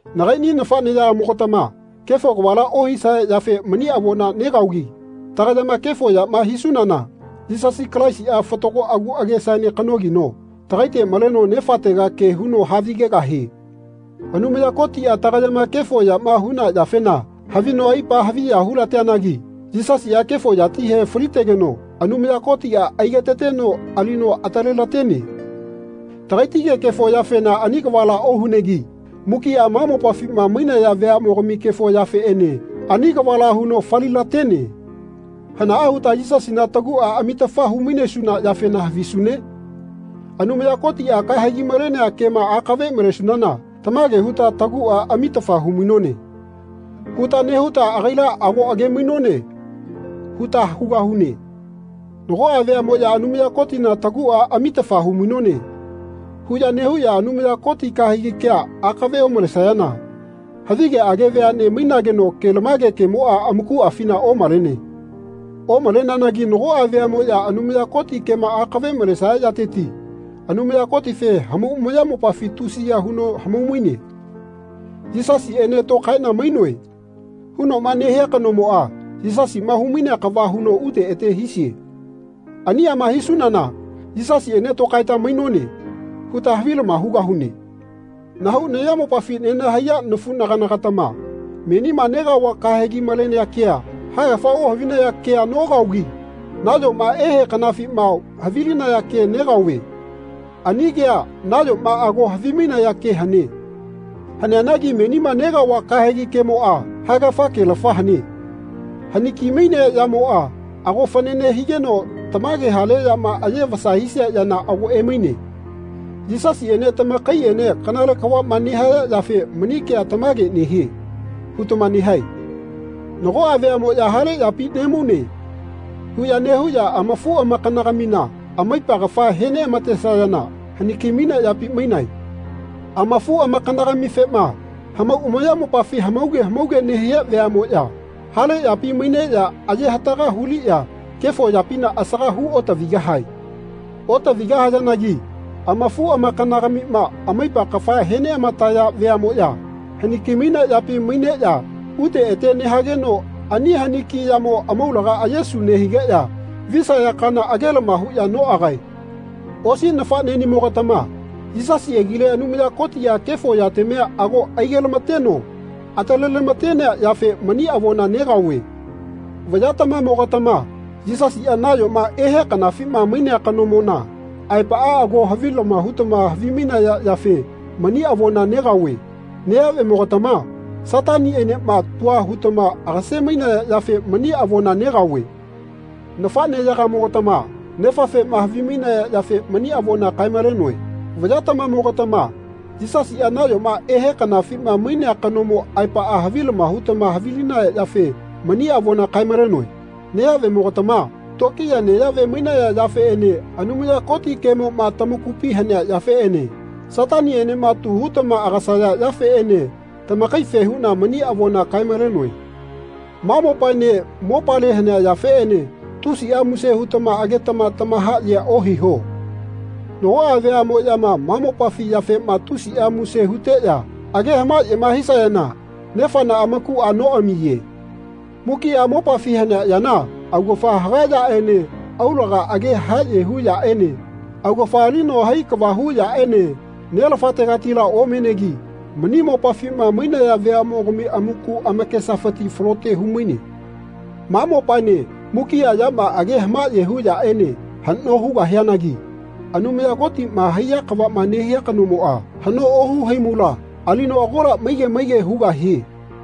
Nagaini nafaneyagamo-gatama kefo kavala ohisaya yafe mani avona negaogi tagayama kefo yama hisunana Yisasi Kalaisia fatago agu agesaene kanogino tagaite maleno Nefatega ke huno havigegahie. Anumaya Kotia tagayama kefo yama huna yafena havino aipa haviya hu-lateanagi Yisasia kefo yatihe falitegeno Anumaya Kotia aigetateno alino atalelatene. Tagaitige kefo yafena ani kavala ohunegi mukia ma mopafima mainaya veamogami kefo yafeene ani kavala huno fali-latene. Hanaa huta Yisasina tagua amitafa hu-mainesuna yafena havisune? Anumaya Kotia kahegi malenea kema akave malesunana tamage huta Tagua amitafa hu-mainone. huta nehuta agaila ago age-mainone huta hugahune. Nagoa veamoya Anumaya Kotina tagua amitafa hu-mainone. huya nehuya Anumaya Koti kahegi kea akave omalesayana havigeage veane mainageno kelamage kemoa amakuafina omalene. Omaleneanagi nagoa veamoya Anumaya Koti kema akave malesaya yateti Anumaya Kotife hamau amayamopafi tusiya huno hamau-maine. Yisasiene tokaena mainoe. hunoma nehea kanomoa Yisasima hu-mainea kava huno ute ete hisie. Aniama hisunana Yisasiene tokaeta mainone. huta havilama hugahune. Nahau nayamopafi nenahaiya nafunagana-gatama menima negaova kahegi malenea kea haegafa ohavinaya kea nokaogi nayoma ehe kanafima havilinaya ke negaove. Ani kea nayoma ago havimainaya ke hane. Haneanagi menima negaova kahegi kemoa haegafa kelafa hane. Haniki-mainea yamoa ago fanane higeno tamage hale yama aye vasa hisia yana ago emaine. Yisasiene tamakaiene kanale kavama nehaya yafe mani kea Tamage nehie. hutama nehae. Nagoa veamoya Hale yapi nemaune. huya nehuya amafuamakana-gamina amaipa kafama he neamatesayana haniki-mainea yapi mainae. Amafuamakana-gamifema hamau amayamopafi hamauge hamauge nehia veamoya hale yapi maineya aye hataga huliya kefo yapina asaga hu otavigahae. Otavigahayanagi amafuamakana-gamina amaipa kafa he neamataya veamoya haniki-mainea yapi maineya ute ete nehageno ani haniki yamo amaulaga ayesu nehigeya visaya kana agelama huya noagae. Osi nafanenimogatama Yisasi agile Anumaya Kotia kefo yatamia ago aige-lamateno atale-lamatenea yafe mani avona negaove. Vayatamamo-gatama Yisasia nayoma ehe kanafima mainea kanomona aepaa ago havilama hutama havimainaya yafe mani avona negaove. Neyavemo-gatama Satanienema tua hutama agase-mainaya yafe mani avona negaove. Nafaneyagamo-gatama Nefafema havimainaya yafe mani avona kae-malenoe. Vayatamamo-gatama Yisasia nayoma ehe kanafima mainea kanomo aepaa havilama hutama havilinaya yafe mani avona kae-malenoe. Neyavemo-gatama tokiya neyave mainaya yafeene Anumaya Koti kemoma tamakupi hanea yafeene Satanienema tu hutama agasaya yafeene tamakaife huna mani avona kae-malenoe. Ma mopaene mopale hanea yafeene tusia muse hutama agetama tamahayea ohiho. Nagoa veamoyama ma mopafi yafema tusia muse huteya age hamayema hisayana Nefana amakua noamiye. Mukia mopafi hanea yana augafa haga neyaene aulaga age haye hu yaene augafa alino hai kava hu yaene Nelafategatila omenegi mani mopafima mainaya veamogami amaku amakesafiti falote humaine. Ma mopaene mukia yama ageya hamaye hu yaene hano hugahianagi Anumaya Kotima haiya kavama nehia kanomoa hano ohu haimula alino agola maige maige hugahie.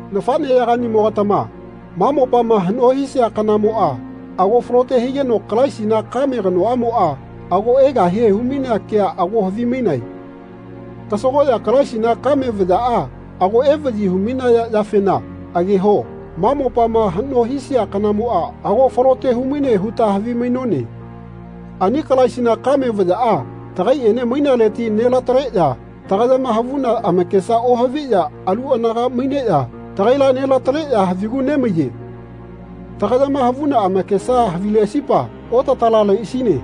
Nafaneyaganimo-gatama ma mopama hano hisia kanamoa ago falote higeno Kalaisina kame kanoamoa ago egahie hu-mainea kea ago havimainae. Kasagoya Kalaisina kame vayaa ago evayi hu-mainaya yafena ageho ma mopama hano hisia kanamoa ago falote humaine huta havimainone. Ani Kalaisina kame vayaa tagaiene mainaleti nelataleya tagayama havuna amakesa ohaviya alu anaga maineya tagaila nelataleya havigu nemaiye. Tagayama havuna amakesama havileasipa otatalaleasine.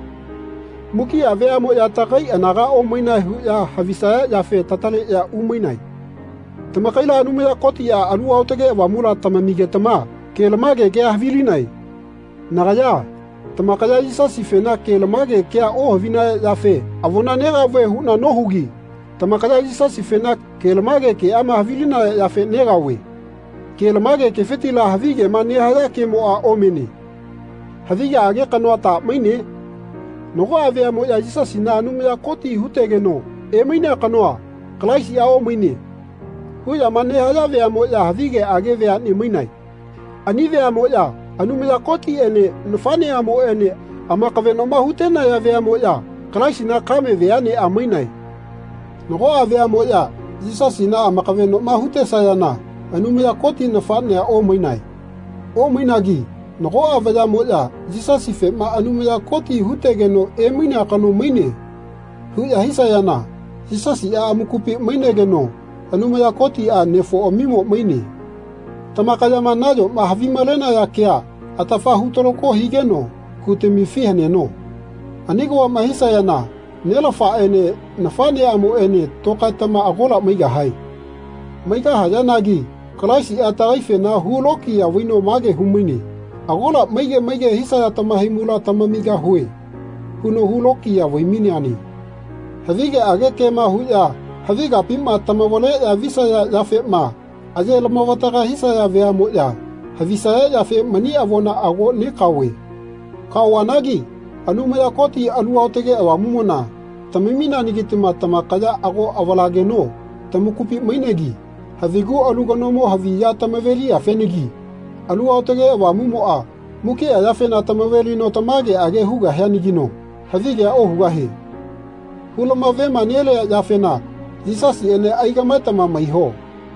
Mukia veamoya tagai anaga omainae huya havisaya yafe tataleya umainae. Tamakaila Anumaya Kotia Alu Aotage Avamula tamamigetama kelamage kea havilinae. Nagaya tamakaya Yisasifena kelamage kea ohavinaya yafe avona negaove huna nohugi tamakaya Yisasifena kelamage keama havilinaya yafe negaove. Ke-lamage kefitila havigema nehaya kemoa omene. Havigeage kanoa ta maine? Nagoa veamoya Yisasina Anumaya Koti hutegeno emainea kanoa, Kalaisia omaine. huyama nehaya veamoya havigeage veane mainae. Ani veamoya Anumaya Kotiene nafaneamoene amakavenoma hutenayana veamoya Kalaisina kame veanea mainae. Nagoa veamoya Yisasina amakavenoma hutesayana Anumaya Koti nafanea omaine. Omainagi nagoa vayamoya Yisasifema Anumaya Koti hutegeno emainea kano maine. huya hisayana Yisasia amakupi mainegeno Anumaya Kotia nefoamimo maine. Tamakayama nayoma havimalenaya kea atafa hutakalo higeno kutamifi haneno. Ani kavama hisayana Nelafaene nafaneamoene tokaetama agola maigahae. Maigahayanagi Kalaisia tagaifena hu lokiya vaino mage humaine Agola maige maige hisaya tamahaimula tamamigahue. huno hu lokiya vai-maineane. Havigeage kema huya havi kapima tamavaleya visaya yafema aye lamavataga hisaya veamoya havisaya yafe mani avona ago nekaove. Kaovanagi Anumaya Koti Alu Aotage Avamumona tamamineanagitama tamakaya ago avalageno tamakupi mainegi havigu alu kanomo havi ya tamave-liyafenagi Alu Aotage Avamumoa mukia yafena tamav nelino tamageage hugahianagino havigea ohugahie. Hulamavema-nelia yafena Yisasiene aigamaetama maiho.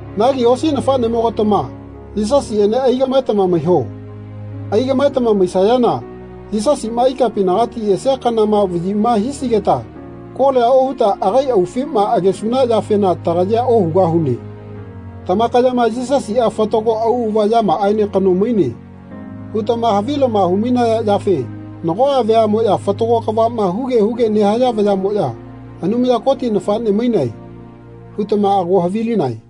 Nagi osi nafanenimogatama Yisasiene aigamaetama maiho. Aigamaetama maisunana Yisasima ikapinagati esia kanama vayima hisigeta kolia ohuta agai augafima agesuna yafena tagayea ohugahune. Tamakayama Yisasia fatago auava yamaaene kano maine. hutama havilama hu-mainaya yafe nagoa veamoya fatago kavama huge huge nehaya veamoya Anumaya Koti nafane mainae. hutama ago havilinae.